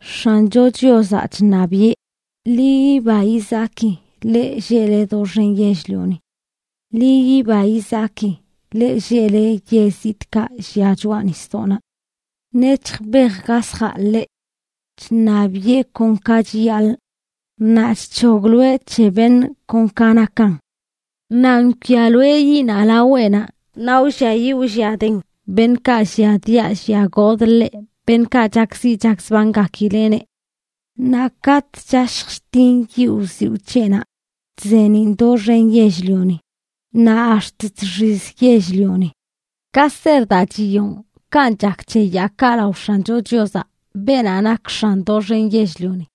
¡X̱ancho Chiozaꞌ chṉabiꞌe! ¡Ḻi yiba yizaki, leꞌ lleꞌle doxen yell-lioni! ¡Ḻi yiba yizaki, leꞌ lleꞌle yell zitꞌkaꞌ llia choꞌa nisdoꞌnaꞌ! Nec̱hj bej gasjaꞌ ḻeꞌ. Chṉabiꞌe kon ka chiyaḻꞌ, naꞌ chc̱hogloeꞌ c̱he beṉꞌ kon ka nakan. Naꞌ nkwialoeꞌ yiꞌnaꞌ laweꞌnaꞌ naꞌ wlliayiꞌ wlliaden beṉꞌkaꞌ lliadiaꞌ lliagodꞌ ḻeꞌ, beṉꞌkaꞌ chakziꞌ chakzbangakileꞌneꞌ. Naꞌ katꞌ chashj chtin yiꞌ wziwꞌ c̱heꞌnaꞌ, chzeeniꞌn doxen yell-lioni, naꞌ ax̱t chxiz yell-lioni. Ka ser daa chiyonꞌ, kanꞌ chak c̱he yaakaꞌ lao X̱ancho Chiozaꞌ, beenaꞌ nak X̱an doxen yell-lioni.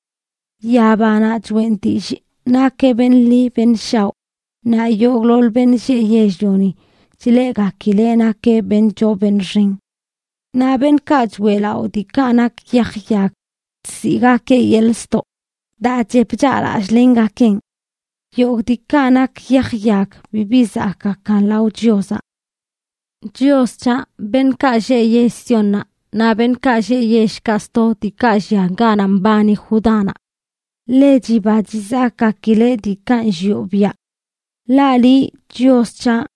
Yabanaꞌ choꞌen dillꞌ nakeꞌ beṉꞌ ḻi beṉꞌ shaoꞌ, naꞌ yogꞌḻoḻ beṉꞌ lleꞌ yell-lioni chleꞌgakileꞌ nakeꞌ beṉꞌ choo beṉꞌ xen. Naꞌ beṉꞌkaꞌ choeꞌlaꞌo diikaꞌ nak yaj yag, chziꞌgakeꞌ yeḻꞌ ztoꞌ daa chep chaꞌlallꞌlengakeꞌn. Yogꞌ diikaꞌ nak yaj yag bibi zakꞌgakan lao Chiozaꞌ. Chios c̱haꞌ, beṉꞌkaꞌ lleꞌ yell Siónnaꞌ, naꞌ beṉꞌkaꞌ lleꞌ yellkaꞌ sto diikaꞌ llia ganaꞌ mbani Judánaꞌ, ḻe chiba chizakꞌgakileꞌ diikaꞌ nllioꞌ biaꞌ. Ḻaꞌ liꞌ, Chios c̱haꞌ,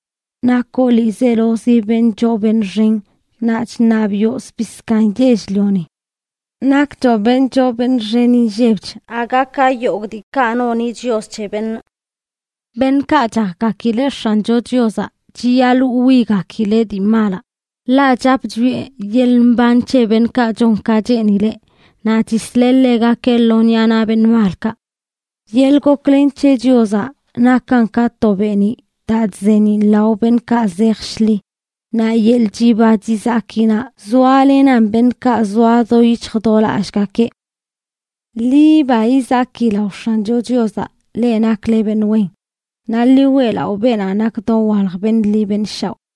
nakoꞌ ḻiizelozi beṉꞌ choo beṉꞌ xen naꞌ chṉabiꞌo zbii zkaaṉ yell-lioni. Nakchoꞌ beṉꞌ choo beṉꞌ xen inllebch aga ka yogꞌ diikaꞌ noni chios c̱he beṉꞌ. Beṉꞌkaꞌ chakgakileꞌ X̱ancho Chiozaꞌ chiyaḻꞌ wwigakileꞌ dii malaꞌ, ḻaꞌ chap chwieꞌ yeḻꞌ mban c̱he beṉꞌkaꞌ chon ka cheenileꞌ, naꞌ chisleꞌ ḻegakeꞌ lo ṉiꞌa naꞌ beṉꞌ malkaꞌ. Yeḻꞌ goklen c̱he Chiozaꞌ nakan ka to beeniꞌ daa chzeeniꞌn lao beṉꞌkaꞌ zej shḻi, naꞌ yeḻꞌ chiba chizakinaꞌ zoalenan beṉꞌkaꞌ zoa do yic̱hj do lallꞌgakeꞌ. ¡Ḻi yiba yizaki lao X̱ancho Chiozaꞌ, leꞌ nakle beṉꞌ wen, naꞌ ḻi weꞌlaꞌo beenaꞌ nak dowalj beṉꞌ ḻi beṉꞌ shaoꞌ!